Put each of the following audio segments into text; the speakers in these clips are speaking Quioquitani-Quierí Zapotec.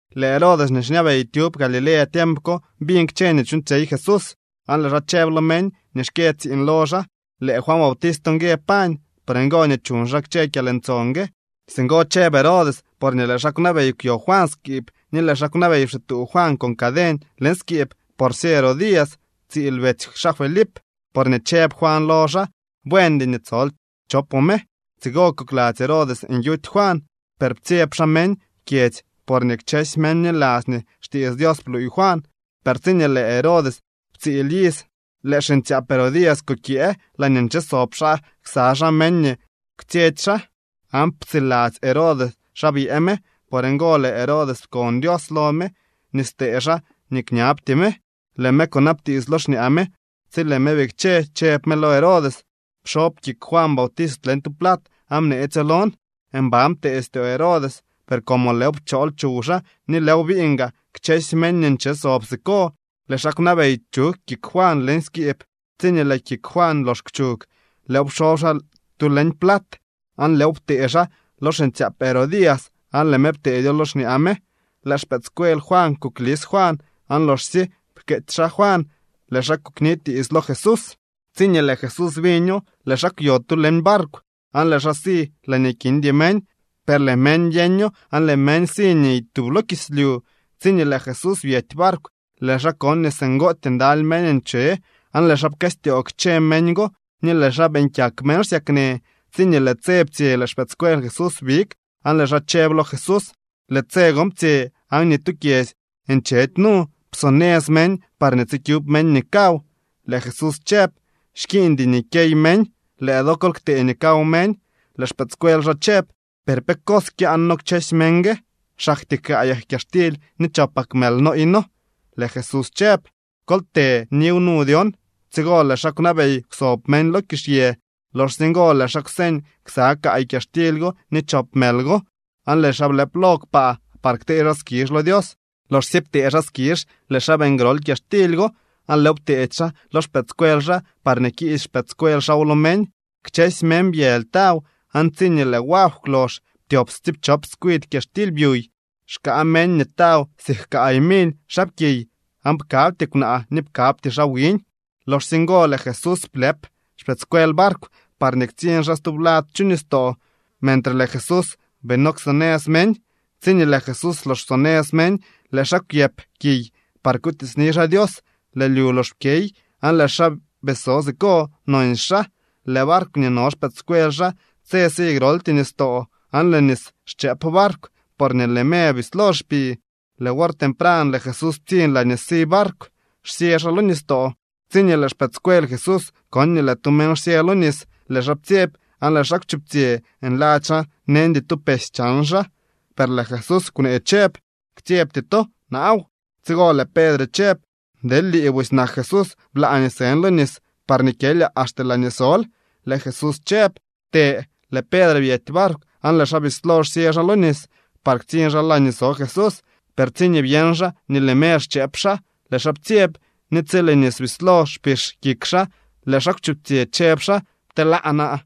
Lëë Herodes nii xñabey tyub Galilea tiemp ko biñ kchë nii chuuñtsyey Jesús, aan lëë xaa chëb lo meñ nii xkyë tsiiñ lo xaa: —Lëë Juan Bautist ngue pañ. Por ngo nii chuñ xaa kchë kyalntson gue. Singo chëb Herodes porñee lëë xaa kwnabey kwyo Juan skiib ni lëë xaa kwnabey pxituu Juan con caden leñ skiib porsye Herodías, tsiil betsy xaa Felip. Porñee chëb Juan lo xaa: —Buendy nii tsol chopoo me. Tsigo kokladzy Herodes nyuty Juan, per ptsyeb xaa meñ kyedzy porñee kchësy meñ bniladzy nii xtiits Dios bluuy Juan. Per tsiñee lëë Herodes ptsiil iz, lëë xiñtsyaap Herodías kukyëë laañee nche sob xaa ksa xaa meñ nii kwtsyetsy xaa, aan ptsiladzy Herodes xa byëë me. Por ngo lëë Herodes pkon Dios lo me nii stee xaa nii kñabtyee me. Lëë me kunabtiits lo xñaa me. Tsi lëë me bikche, chëb me lo Herodes: —Pxob kik Juan Bautist leñ tu plat aan bneetsyo lon. Mban ptee styoo rey Herodes, per como lëëw pchool chuw xaa ni lëëw biñ gaa kchësy meñ nii nche sob siko, lëë xaa kwnabey chug kik Juan leñ skiib. Tsiñee lëë kik Juan lox kwchug, lëëw pxob xaa tu leñ plat, aan lëëw ptee xaa lo xiñtsyaap Herodías, aan lëë me pteedyo lo xñaa me. Lëë xpëëdscuel Juan kuklis Juan aan loxsye pkeetsy xaa Juan, lëë xaa kunitiits lo Jesús. Tsiñee lëë Jesús biño, lëë xaa kwyo tu leñ barkw, aan lëë xaa si laañee kindy meñ. Per lëë meñ byeño aan lëë meñ siniy tub lo kislyu. Tsiñee lëë Jesús byety barkw, lëë xaa kon nii singootyee ndaly meñ nche, aan lëë xaa pkëstyoo kchë meñ go ni lëë xaa beeñ kyak meñ xsyaknë. Tsiñee lëë tse ptsye lëë xpëëdscuel Jesús big aan lëë xaa chëb lo Jesús: —Lëë tse gon ptsye, aan ni tu kyedzy nchedy nu. Psonëz meñ parñee tsikyub meñ nii kaw. Lëë Jesús chëb: —Xkiiñdy nii kyey meñ. Lëë do kol ktee nii kaw meñ. Lëë xpëëdscuel xaa chëb: —¿Per pe cos kyaan noo kchësy meñ gue? Xaktyee kaayak kyaxtily ni chopak mël nooy noo. Lëë Jesús chëb: —Kol të niw nu dyon. Tsigo lëë xaa kwnabey kwsob meñ lo kizhyë. Loxsye ngo lëë xaa kwseñ ksa kaay kyaxtily go ni chop mël go, aan lëë xaa blëp lo kpaa par ktee xaa skizh lo Dios. Loxsye ptee xaa skizh lëë xaa beeñ grol kyaxtily go aan lëëw pteedy xaa lo xpëëdscuel xaa parñee kiisy xpëëdscuel xaaw lo meñ. Kchësy meñ byëly taw, aan tsiñee lëë wagw kwlox, ptyop tsiipchop tskwidy kyaxtily byuy. Xkaa meñ nii taw siik kaay mily xaapkiy aan pkabty kwnaa ni pkabty xaa wiñ. Loxsye ngo lëë Jesús blëp xpëëdscuel barkw parñee ktsiñ xaa stublad chu nistoo klo xaa mentre lëë Jesús bii no ksonëz meñ. Tsiñee lëë Jesús lox psonëz meñ, lëë xaa kwyëp kiy par kutiitsni xaa Dios. Lëë lyu lox pkyey aan lëë xaa bii so siko nonsy xaa. Lëë barkw nii no xpëëdscuel xaa tse si groltyee nistoo, aan lëë nis xchëëp barkw, porñee lëë me bislo xpi. Lëë wor tempran lëë Jesús ptsiñ laañee si barkw xsyë xaa lo nistoo. Tsiñee lëë xpëëdscuel Jesús kon nii lëë tu meñ xsyë lo nis, lëë xaa ptsyeb aan lëë xaa kwchuptsyë nladzy xaa neñdy tu pesy chan xaa. Per lëë Jesús kwnee chëb: —¡Ktsyebty to. Naaw! Tsigo lëë Pedre chëb: —Deel lii busy nak Jesús, blaa nii sën lo nis parñee kyelyaa axte laañee sol. Lëë Jesús chëb: —Të. Lëë Pedre byety barkw aan lëë xaa bislo xsyë xaa lo nis par ktsiñ xaa laañee so Jesús. Per tsiñee byeñ xaa nii lëë me xchëëp xaa, lëë xaa ptsyeb. Ni tsi lëë nis bislo xpix kik xaa, lëë xaa kwchuptsyë chëb xaa: —¡Pteelaa naa!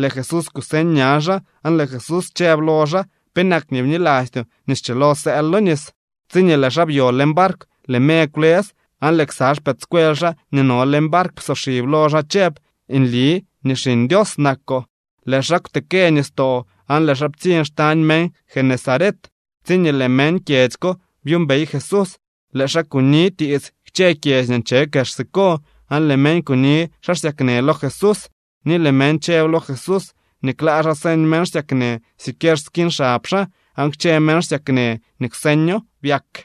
Lëë Jesús kuseñ ña xaa aan lëë Jesús chëb lo xaa: —¿Penak nii bnilastyoo nii schilo sëël lo nis? Tsiñee lëë xaa byo leñ barkw, lëë me kwlës. Aan lëë ksa xpëëdscuel xaa nii no leñ barkw psoxib lo xaa chëb: —Nli nii Xiñ Dios nakoo. Lëë xaa kwtekë nistoo aan lëë xaa ptsiñ xtañ meñ Genesaret. Tsiñee lëë meñ kyedzy ko byuumbey Jesús, lëë xaa kunitiits kchë kyedzy nii nche kex siko, aan lëë meñ kuni xaa xsyaknë lo Jesús. Ni lëë meñ chëb lo Jesús nii klaa xaa señ meñ xsyaknë siquier skiñ xab xaa, aan kchë meñ xsyaknë nii kwseño byak.